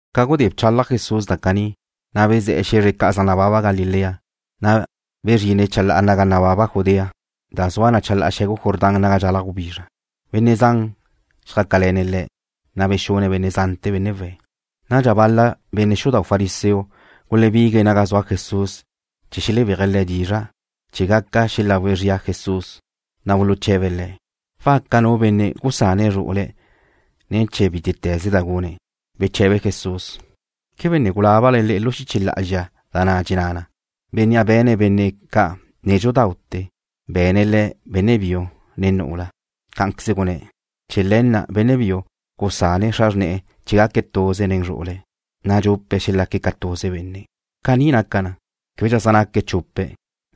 Ca gudé bchalaj Jesús da caní, na' bezé̱'e̱ xe̱zre ca' zaj nababa Galilea, na' bezrine̱' chalá'ala naga nababa Judea, da zua chalá'ala xe̱gu Jordán naga dxalaj gubizra. Benne' zan zjácale̱ne̱' Le̱', na' bexune̱' benne' zante̱, benne' we̱'. Nadxa bal-la benne' xudau' fariseo gulebigue̱' naga zua Jesús chee̱ xelebéaje̱' Le̱' dizra' chee̱ gaca xelagu zrie̱' Jesús, na' buluche̱be̱' Le̱': ―¿Waca nu benne' gusane̱' zru'ule̱' ne̱ chee̱ bítete̱ze da gune̱'? Beche̱be Jesús: ―¿Quebe ne gulábale le'e lu xiche lá'azxa da na' dxenná na: “Bennea' be̱ne̱' benne' ca' nédxudaute̱ be̱ne̱' le̱' benne' biu, ne nu'ula”? Cá'anqueze gunné̱': “Chee̱ le̱ na' benne' biu gusane̱' xra xrne̱'e̱ chee̱ gaque̱' tuze nen zru'ule̱', na' dxupe̱' xelaque̱' ca tuze benne'.” Caní naca na, québedxa zaj naque̱' chupe̱',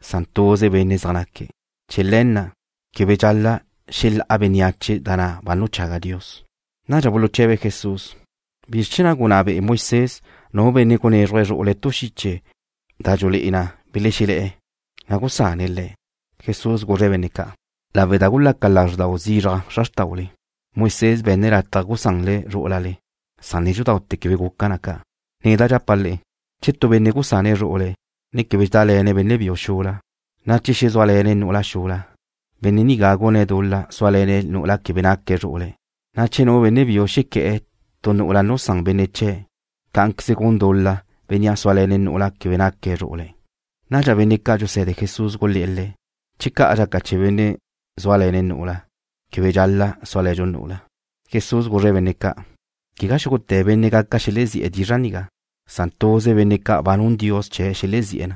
san tuze benne' zaj naque̱'. Chee̱ le̱ na' quebe dxal-la' xelá'a bénneache da na' ba nuchaga Dios. Nadxa buluche̱be̱' Jesús: ―¿Bizr chee̱ na' gunná be'e Moisés nu benne' gunézruje̱' zru'ule̱' tu xiche da dxulé'e na belexelé̱'e̱, na' gusane̱' le̱'? Jesús guzre̱' benne' ca': ―Caní be̱ne̱' lawe' da gulaca lazrdau zizraj xra xrtaule. Moisés be̱nne̱' lataj gusanle zrú'ulale, san nédxudaute̱ quebe guca na ca'. Neda' dxapa' le'e, che tu benne' gusane̱' zru'ule̱', ne quebe dxedále̱ne̱' benne' biu xula, na' che xezúale̱ne̱' nu'ula xula, benne' nigá gune̱' dul-la súale̱ne̱' nu'ula quebe naque̱' zru'ule̱', na' che nu benne' biu xequé̱'e̱ tu nu'ula nusán benne' chee̱', cá'anqueze gun dul-la bénnea' súale̱ne̱' nu'ula quebe naque̱' zru'ule̱'. Nadxa benne' ca' dxuse̱de Jesús gulé̱'e̱ Le̱': ―Che ca' dxaca chee̱ benne' zúale̱ne̱' nu'ula, quebe dxal-la' súale̱ntu' nu'ula. Jesús guzre̱' benne' ca': ―Quegá xúgute̱ benne' gaca xelezí'e̱ dizra' nigá, san tuze benne' ca' ba nun Dios chee̱' xelezí'e̱ na.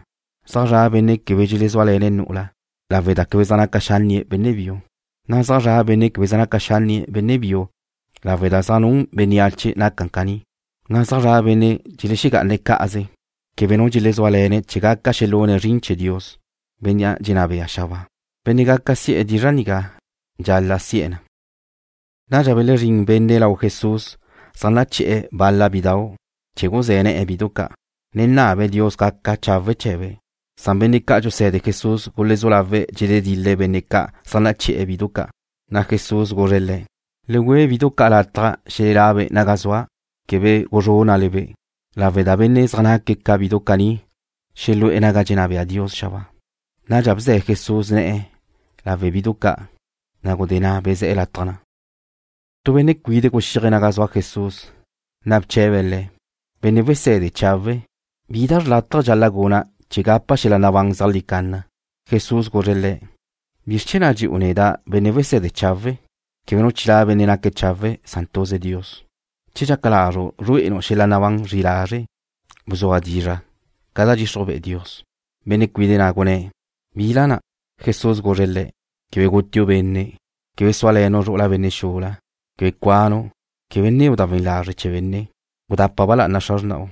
Zaj zra' benne' quebe dxelezúale̱ne̱' nu'ula lawe' da quebe zaj naca xánnie̱' benne' biu. Na' zaj zra' benne' québedxa zaj naca xánnie̱' benne' biu lawe' da zaj nun bénneache naca caní. Na' zaj zra' benne' dxelexegá'ane̱' cá'aze, quebe nu dxelezúale̱ne̱' chee̱ gaca xelune̱' zrin chee̱ Dios, Bénnea' dxenná be'e̱ xabáa. Benne' gaca si'e̱ dizra' nigá dxal-la' si'e̱ na. Nadxa belezrín benne' lau Jesús zaj naché̱'e̱ bal-la bidau' chee̱ guzé̱ ne̱'e̱ bidu ca', ne nabe̱' Dios gaca chawe' chee̱be', san benne' ca' dxuse̱de Jesús gulezú lawe̱' dxeledil-le̱' benne' ca' zaj naché̱'e̱ bidu ca'. Jesús guzre̱' le̱': ―Le güe bidu ca' lataj xelela'be' naga zua'. Quebe guzrúnnale-be', lawe' da benne' zaj naque̱' ca bidu caní xelu'e̱ naga dxenná bea Dios xabáa. Nadxa bze̱ Jesús ne̱'e̱ lawe' bidu ca', na' gudé na' bezé̱'e̱ lataj na'. Tu benne' cuide' guxíaje̱' naga zua Jesús, na' bche̱be̱' Le̱': ―Benne' Wese̱de chawe'. ¿Bi da xrlátaje dxal-la' guna' chee̱ gapa' xel-la' nabán zeajlí canna? Jesús guzre̱' le̱': ―¿Bizr chee̱ na' dxu'u neda', benne' wese̱de chawe'? Quebe nu chilá' benne' naque̱' chawe', san tuze Dios. Che dxaca lazru' zrué'enu' xel-la' nabán li lazre', bzua dizra' ca bdxixruj be'e Dios. Benne' cuide' na' gunné̱': ―¿Bila na'? Jesús guzre̱' le̱': ―Quebe gutiu' benne'. Quebe súale̱nu' zru'ula benne' xula. Quebe cuanu'. Quebe nneu' da we̱n lazre' chee̱ benne'. Gudapa ba lá'ana xra xrna'u.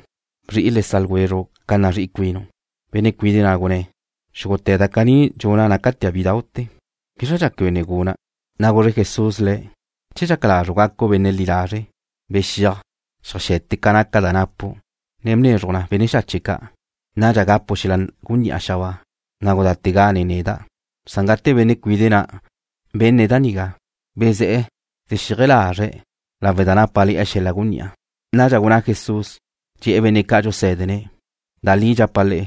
Bzri'i le sa' ljwezru' ca nazrí'i cuinu'. Benne' cuide' na' gunné̱': ―Xúgute̱ da caní dxuna' nácatea' bídau'te̱. ¿Bízradxa quebe ne guna'? Na' guzre Jesús le̱': ―Che dxaca lazru' gacu' benne' li lazre', bexíaj, xeaje̱te ca naca da napu', ne bnezruj na benne' xache' ca'. Nadxa gapu' xel-la' gunní'a xabáa. Na' gudátega nen neda'. Gate benne' cuide' na' benne̱' da nigá, bezé̱'e̱ dxexíaje lazre̱' lawe' da nápale̱'e̱ xel-la' gunní'a. Nadxa gunná Jesús, dxe̱'e̱ benne' ca' dxusé̱dene̱': ―Da li dxapa' le'e,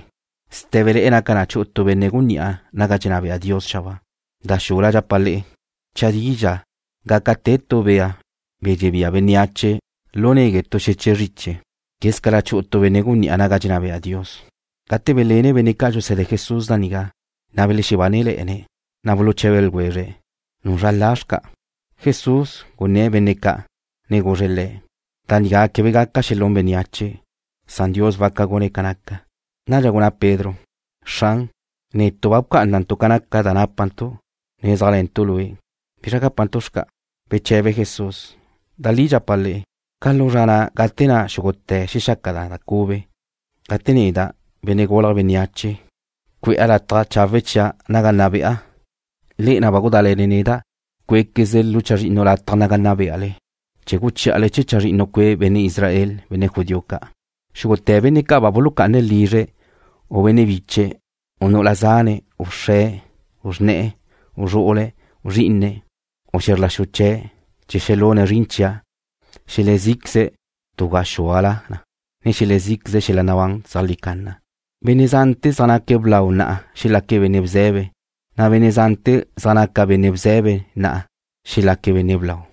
sté̱bele̱'e̱ naca chu'u tu benne' gunní'a naga dxenná bea Dios xabáa. Da xula dxapa' le'e, chadidxa gaca te tu bea', be̱ dxebía bénneache lu negue' tu xeche' zriche, quézcala chu'u tu benne' gunní'a naga dxenná bea Dios. Gate belenne̱' benne' ca' dxuse̱de Jesús da nigá, na' belexebánele̱'e̱ne̱', na' buluche̱be ljwezre̱': ―¿Nuzra la xca'? Jesús guné̱'e̱ benne' ca', ne guzre̱' le̱': ―Da nigá quebe gaca xelún bénneache, san Dios waca gune̱' ca naca. Nadxa gunná Pedro: ―Xran, netu' ba bcá'anantu' ca naca da nápantu', ne zéajle̱ntu' Lue'. ¿Bizra gápantu' xca'? Beche̱be Jesús: ―Da li dxapa' le'e, ca lu zra na' gate na' xúgute̱ xelexaca na cube, gate neda', Benne' Gulje̱' Bénneache, cue'a lataj chawe' chia' naga nna be'a, le'e na' ba gudále̱le neda' cué'quezle lu chazrinnu lataj naga nna beale, chee̱ guchí'ale chee̱ chazrinnu cue' benne' Israel, benne' judío ca'. Xúgute̱ benne' ca' ba bulucá'ane̱' lizre̱', u benne' biche̱', u nu'ula zane̱', u xre̱', u xrne̱'e̱, u zru'ule̱', u zrí'ine̱', u xe̱zr la xu chee̱', chee̱ xelune̱' zrin chia', xelezí'queze̱' tu gaxúala na, ne xelezí'queze̱' xel-la' nabán zeajlí canna. Benne' zante̱ zaj naca blau na'a xelaque̱' benne' bze̱be, na' benne' zante̱ zaj naca benne' bze̱be na'a xelaque̱' benne' blau.